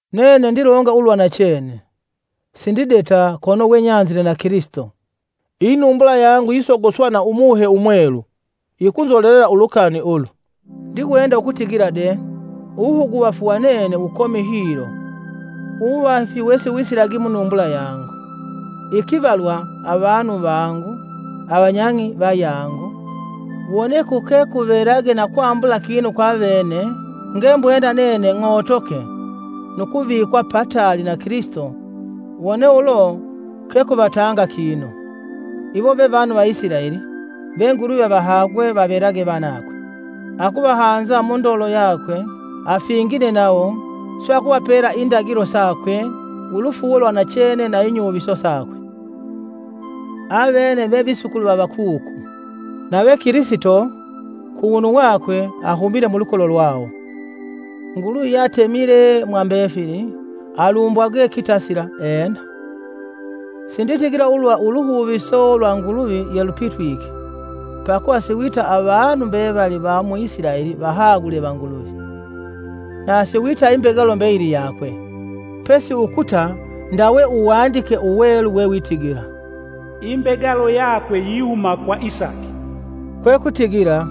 Nene ndilonga ulwa nachene, sindideta kono we nyanzile na Kilisito. Inumbula yangu yisogoswa na Umuhe Umwelu, yikunzolelela ulukani ulu. Ndiwenda ukutigila de uwuhuguvafu wa nene wukomi hilo: uwuvafi wesiwisilagi munumbula yangu. Ikivalwa avanu vangu, avanyang'i vayangu! Wone kuke kuvelage na kwambula kinu kwa vene ngembwenda nene ng'otoke nu kuvikwa pataali na Kilisito wone ulo kekuvatanga kinu! Iwo ve vanu va Isilaeli ve Nguluvi avahagwe vavelage vanakwe, akuvahanza mundolo yakwe, afingine nawo, swe akuvapela indagilo sakwe, ulufuuwo lwanachene na inyuviso sakwe. Avene ve visukulu va vakuku, nave Kilisito, kuwunu wakwe, ahumite mulukolo lwawo. Nguluvi yeatemile mwa mbefili, alumbwagwe kitasila! Ena. Sinditigila ulwa uluhuviso lwa Nguluvi yelupitwike; pakuva siwita avanu mbevali va mu Isilaeli vahagule va Nguluvi. Nasi wita imbegalo mbeyili yakwe. Pesi ukuta ndawe Uwandike Uwelu wewitigila, “Imbegalo yakwe yihuma kwa Isaki.” Kwekutigila,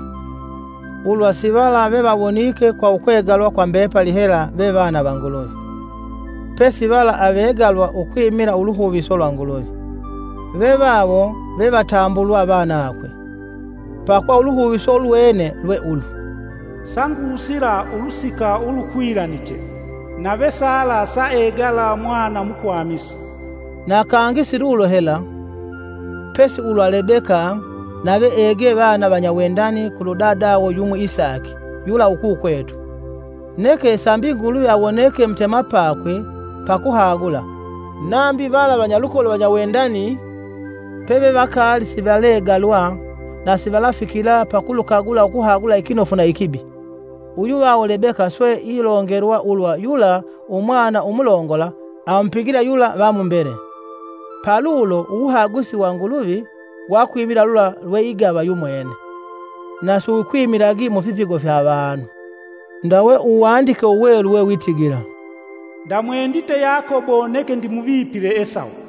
ulwa sivala vevawonike kwa ukwegalwa kwa mbepali hela ve vana va Nguluvi, pesi vala avegalwa ukwimila uluhuviso lwa Nguluvi, ve vawo vevatambulwa vanakwe. Pakuva uluhuviso ulwene lwe ulu, “Sangusila ulusika ulukwilaniche, nave Sala saegala mwana mukwamisi.” Na kangi si lulo hela, pesi ulwa Lebeka nave egee vana vanyawendani kulu dadawo yumwi Isaki, yula ukukwetu. Neke sambi Nguluvi awoneke mutemapakwe pa kuhagula, nambi vala vanyalukolo vanyawendani pevevakaali sivalegalwa na sivalafikila pakulukagula ukuhagula ikinofu na ikibi, Uyuvawo Lebeka swe ilongelwa ulwa yula umwana umulongola amupigila yula va mumbele. Palulo uwuhagusi wa Nguluvi wakwimila lula lweigava yumwene, na siwukwimilagi mufipigo fya avanu. Ndawe Uwandike Uwelu we witigila: “Ndamwendite Yakobo neke ndimuvipile Esawu.”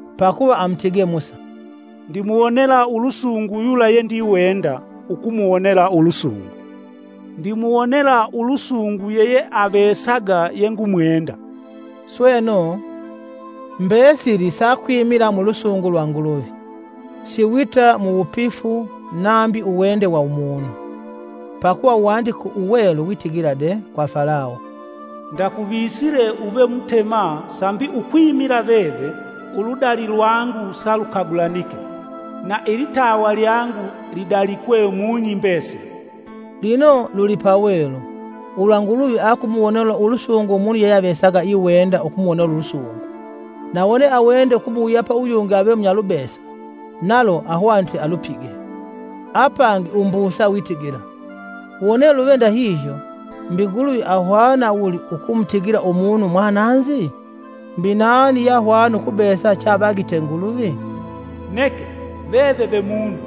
Pakuva amutige Musa: “Ndimuwonela ulusungu yula yendiwenda, ukumuwonela ulusungu; ndimuwonela ulusungu yeyeavesaga yengumwenda.” Sweno, mbesili sakwimila mulusungu lwa Nguluvi, si wita mu wupifu nambi uwende wa umunu. Pakuva Uwandike Uwelu witigila de kwa Falawo: “Ndakuvisile uve Mutema sambi ukwimila veve, uludali lwangu salukagulanike, na ilitawa lyangu lidalikwe mung'i mbesili.” Lino, lulipawelu, ulwa Nguluvi akumuwonela ulusungu umunu yeyeavesaga iwenda ukumuwonela ulusungu, na wone awende ukumuwuyapa uyungi ave munyalubesa, nalo ahwanite alupige. Apangi umbusa witigila, “Wone luve ndahihyo, mbi Nguluvi ahwana wuli ukumutigila umunu mwananzi? Mbi nani yeahwana ukubesa cheavagite Nguluvi?” Neke, veve ve munu,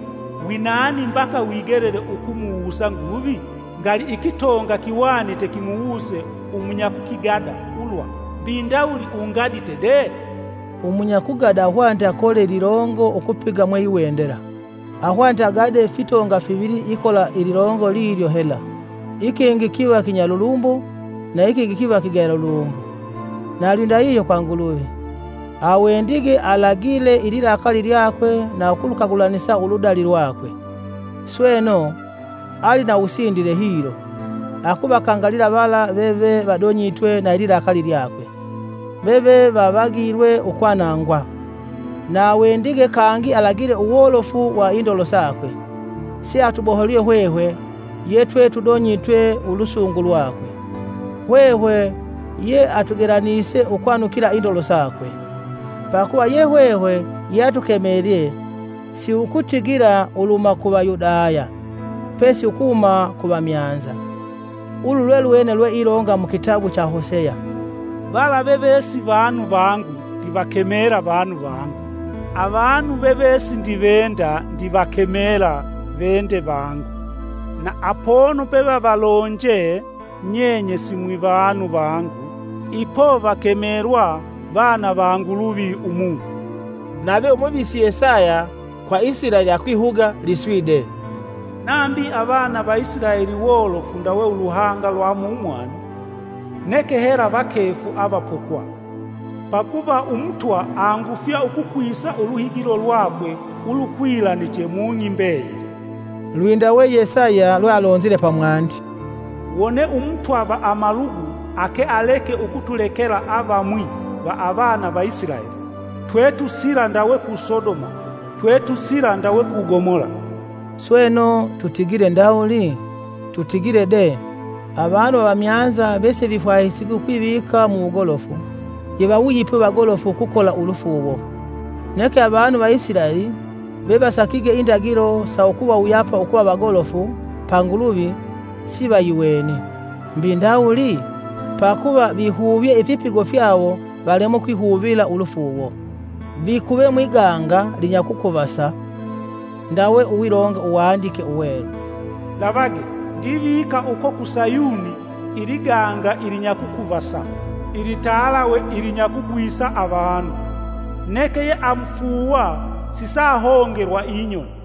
winani mbaka wigelele ukumuwusa Nguluvi? Ngali ikitonga kihwanite kimuwuse umunyakukigada ulwa, “Mbi ndawuli ungadite de?” Umunyakugada ahwanite akole ililongo ukupiga mweiwendela, ahwanite agade fitonga fivili ikola ililongo lilyo hela, ikingi kiva kinyalulumbo, na ikingi kiva kigayalulumbo. Na lwindahihyo kwa Nguluvi. Awendige alagile ililakali lyakwe na ukulukagulanisa uludali lwakwe. Sweno; ali na uwusindile hilo, akuvakangalila vala veve vadonyitwe na ililakali lyakwe, veve vavagilwe ukwanangwa. Na awendige kangi alagile uwolofu wa indolo sakwe, seatuboholye hwehwe ye twe tudonyitwe ulusungu lwakwe, hwehwe yeatugelanise ukwanukila indolo sakwe. Pakuva ye hwehwe yeatukemelye si ukutigila uluhuma ku Vayudaya, pesi ukuhuma ku vamyanza. Ulu lwelwene lweilonga mukitabu cha Hoseya: “Vala veve si vanu vangu ndivakemela: ‘Vanu vangu!’ Avanu veve sindivenda ndivakemela: ‘Vende vangu!’ Na apono pevavalonje: Nyenye ‘Simwivanu vangu’ ipo vakemelwa ‘Vana va Nguluvi umumi!’” Nave Umuvisi Yesaya, kwa Isilaeli akwihuga liswi de; “Nambi avana va Isilaeli wolofu ndawe uluhanga lwa mumwani, neke hela vakefu avapokwa; pakuva Umutwa angufya ukukwisa uluhigilo lwakwe ulukwilaniche mung'i mbeyili.” Lwindawe Yesaya lwealonzile pamwandi, “Wone Umutwa va amalugu ake aleke ukutulekela avamwi va avana va Isilaeli, twetusila ndawe ku Sodoma, twetusila ndawe ku Gomola.” Sweno, tutigile ndawuli? Tutigile de! Avanu avamyanza vesivifwahisigi ukwivika mu wugolofu, yevawuyipwe vagolofu ukukola ulufuuwo, neke avanu va Isilaeli vevasakige indagilo sa ukuvawuyapa ukuva vagolofu pa Nguluvi, sivayiweni. Mbi ndawuli? Pakuva vihuvyee ifipigo fyawo valemwe ukwihuvila ulufuuwo. Vikuve mwiganga linyakukuvasa. Ndawe uwilonga Uwandike Uwelu: “Lavage! Ndivika uko ku Sayuni iliganga ilinyakukuvasa ilitalawe ilinyakugwisa avanu. Neke yeamufuuwa sisaahongelwa inyoni!”